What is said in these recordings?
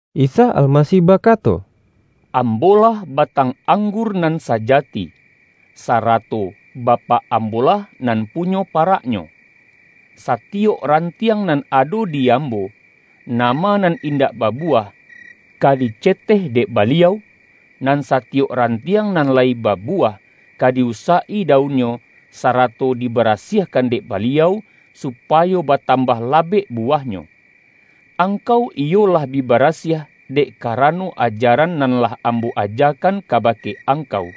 Isa Almasih bakato,”Ambo-lah batang anggur nan sajati, sa-rato Bapak Ambo-lah nan punyo pa-raknyo. Satiyok rantiang nan ado di Ambo, nama nan indak babuwah, ka diceteh dek Baliau, nan satiyok ran-tiang nan layi babuwah, ka di-usak-i daunnyo, sarato dibarasiahkan dek Ba-liau, supayo batambah labek buwah-nyo. Angkau iyo lah bi barasiah, dek karano ajaran nan lah Ambo ajakan kabake angkau.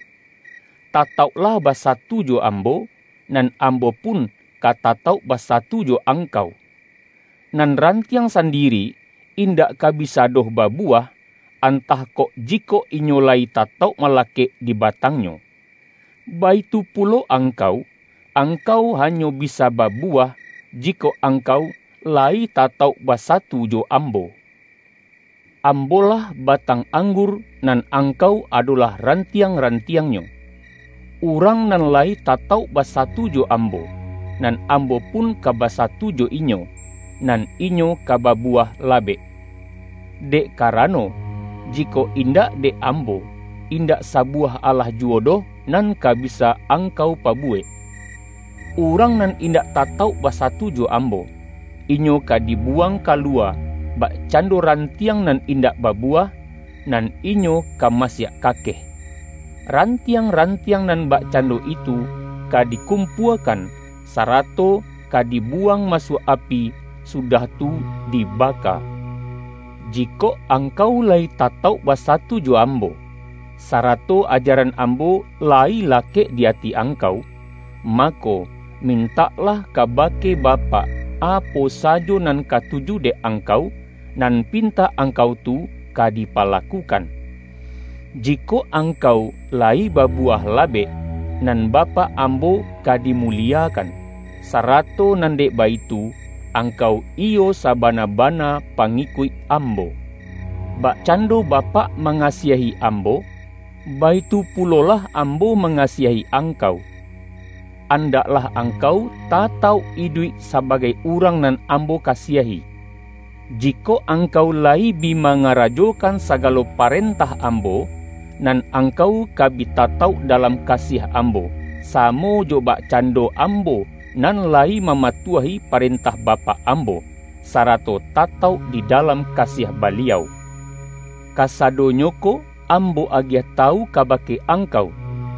Tatauklah basatu jo Ambo, nan Ambo pun ka tatauk basa-tu jo angkau. Nan rantiang sandiri, in-dak ka bisa doh babuwah, antah kok, jikok inyo layi tatauk malakek di ba-tangnyo. Baitu pulo angkau, angkau hanyo bisa babuwah, jikok angkau la-yi tatauk basatu jo Ambo. Ambo-lah batang anggur, nan ang-kau adolah rantiang-rantiangnyo. Urang nan layi tatauk basatu jo Ambo, nan Ambo pun ka basatu jo inyo, nan inyo ka babuwah labek. Dek karano, jikok indak dek Ambo, indak sabuwah alah juwo doh nan ka bisa angkau pa-buwek. Urang nan indak tatauk basa-tu jo Ambo, inyo ka dibuwang kaluwa bakcando rantiang nan indak babuwah, nan inyo ka masiak kakeh. Rantiang-rantiang nan bakcando itu ka dikum-puakan, sarato ka dibuwang masuak api, sudah tu dibaka. Jikok angkau la-yi tatauk basatu jo Ambo, sarato ajaran Ambo layi lakek di ati angkau, mako, mintaklah kabake Bapak, apo sajo nan katuju dek angkau, nan pintak angkau tu ka dipalakukan. Jikok angkau layi babuwah labek, nan Bapak Ambo ka dimuliekan, sarato nan dek baitu, ang-kau iyo sabana-bana pangikuik Ambo. Bakcando Bapak mangasiahi Ambo, baitu pulolah Ambo mangasiahi ang-kau. Andaklah angkau tatauk iduik sa-bagai urang nan Ambo kasiahi. Jikok angkau layi bi mangarajokan sagalo pa-rentah Ambo, nan angkau ka bi tatauk dalam kasiah Ambo, samo jo bakcan-do Ambo nan layi mamatuahi paren-tah Bapak Ambo, sarato tatauk di da-lam kasiah Baliau. Kasadonyo ko Ambo agiah tawu kabake angkau,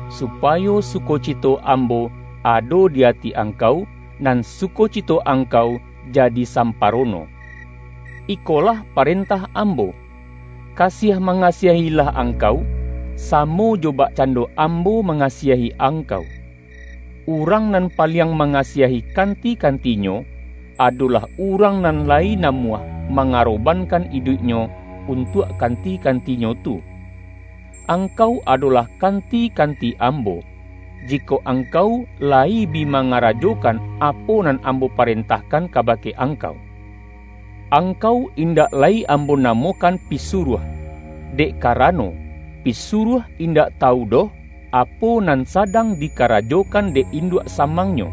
supayo sukocito Ambo ado di ati angkau, nan sukocito ang-kau jadi samparono. Ikolah parentah Ambo: Kasiah mangasiah-ilah angkau, samo jo bakcando Ambo mangasiahi angkau. Urang nan paliang manga-siahi kanti-kantinyo, adolah urang nan lai namuah mangarobankan iduiknyo untuak kanti-kantinyo tu. Angkau adolah kanti-kanti Ambo, jikok angkau layi bi mangarajokan apo nan Ambo parentahkan kabake angkau. Ang-kau indak lai Ambo namokan pisuruah, dek karano, pisuruah indak tawu doh, apo nan sadang dikarajokan dek in-duak samangnyo.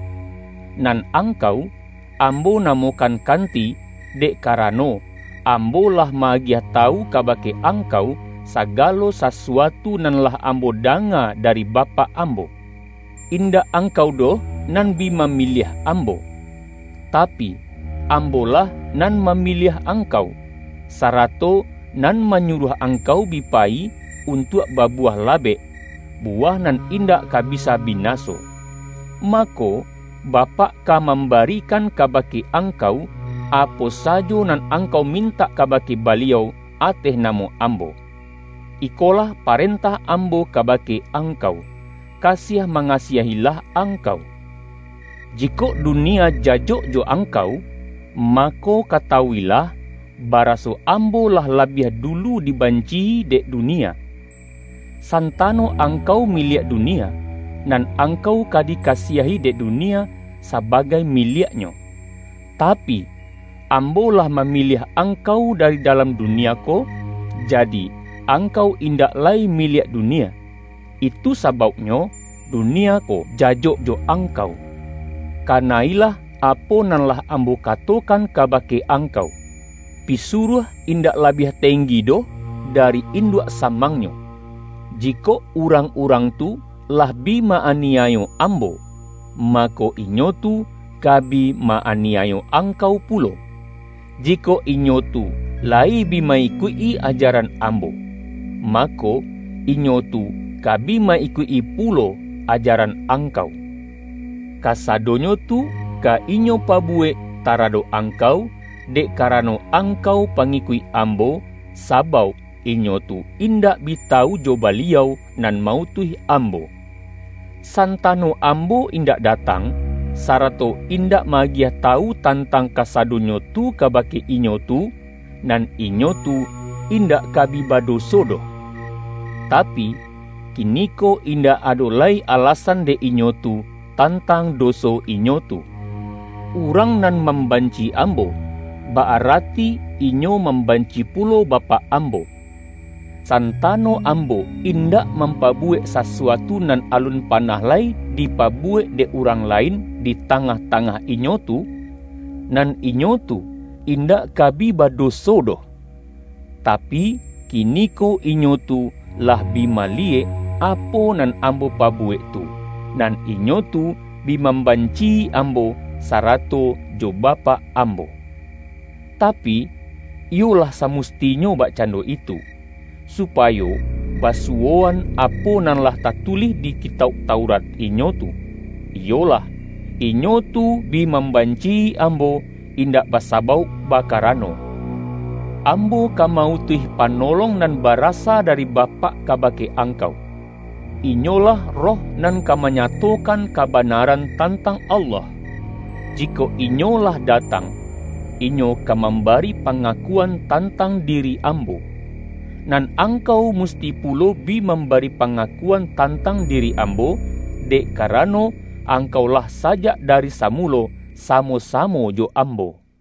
Nan angkau, Ambo namokan kanti, dek karano, Ambo lah ma-agiah tawu kabake angkau, sagalo sasuatu nan lah Ambo danga dari Ba-pak Ambo. Indak angkau doh nan bi mamiliah Ambo. Tapi, Ambo-lah nan mamiliah angkau, sarato nan manyu-ruah angkau bi payi, untuak babuwah labek — buwah nan indak ka bisa bina-so. Mako, Bapak ka mambarikan kaba-ke angkau, apo sajo nan angkau mintak kabake Baliau ateh namo Ambo. Iko-lah parentah Ambo kabake angkau: Ka-siah mangasiah-ilah angkau.” ”Jikok dunia jajok jo angkau, ma-ko, katawuilah, baraso Ambo lah labiah dulu dibanci-i dek dunia. San-tano angkau miliak dunia, nan angkau ka dikasiahi dek dunia sabagai miliak-nyo. Tapi, Ambo lah mamiliah angkau dari dalam dunia ko, jadi, angkau in-dak lai miliak dunia. Itu sabauknyo dunia ko jajok jo angkau. Kana-ilah apo nan lah Ambo katokan kabake angkau, ’Pisuruah indak labiah teng-gi doh dari induak samangnyo.’ Ji-kok urang-urang tu lah bi ma-aniayo Ambo, mako, inyo tu ka bi ma-aniayo angkau pulo. Jikok inyo tu layi bi ma-ikuik-i ajaran Ambo, mako, inyo tu ka bi ma-ikuik-i pulo ajaran angkau. Kasadonyo tu ka inyo pabuwek ta-radok angkau, dek karano angkau pa-ngikuik Ambo, sabauk inyo tu indak bi tawu jo Baliau nan ma-utuih Ambo. Santano Ambo indak datang, sara-to indak ma-agiah tawu tantang kasa-donyo tu kabake inyo tu, nan inyo tu indak ka bi badoso doh. Tapi, kiniko indak ado lai alasan dek inyo tu, tan-tang doso inyo tu. Urang nan mam-banci Ambo, ba-arati inyo mambanci pulo Bapak Ambo. Santano Ambo indak mampabuwek sasuatu nan alun panah lai dipabuwek dek urang lain di tangah-tangah inyo tu, nan inyo tu indak ka bi badoso doh. Tapi, ki-niko inyo tu lah bi maliyek, apo nan Ambo pabuwek tu, nan inyo tu bi mam-banci-i Ambo sarato jo Bapak Ambo. Tapi, iyo lah samustinyo bakcando itu, supayo basuwoan apo nan lah ta-tulih di Kitauk Taurat inyo tu, iyolah: ’Inyo tu bi mambanci-i Ambo, indak basabauk bakarano.’ Ambo ka ma-utuih Panolong nan barasa dari Bapak kabake ang-kau. Inyolah Roh nan ka manyatokan kabanaran tantang Allah. Jikok Inyo lah datang, Inyo ka mambari panga-kuan tantang diri Ambo. Nan ang-kau musti pulo bi mambari pangaku-an tantang diri Ambo, dek karano, angkau lah sajak dari samulo samo-samo jo Ambo. YAHYA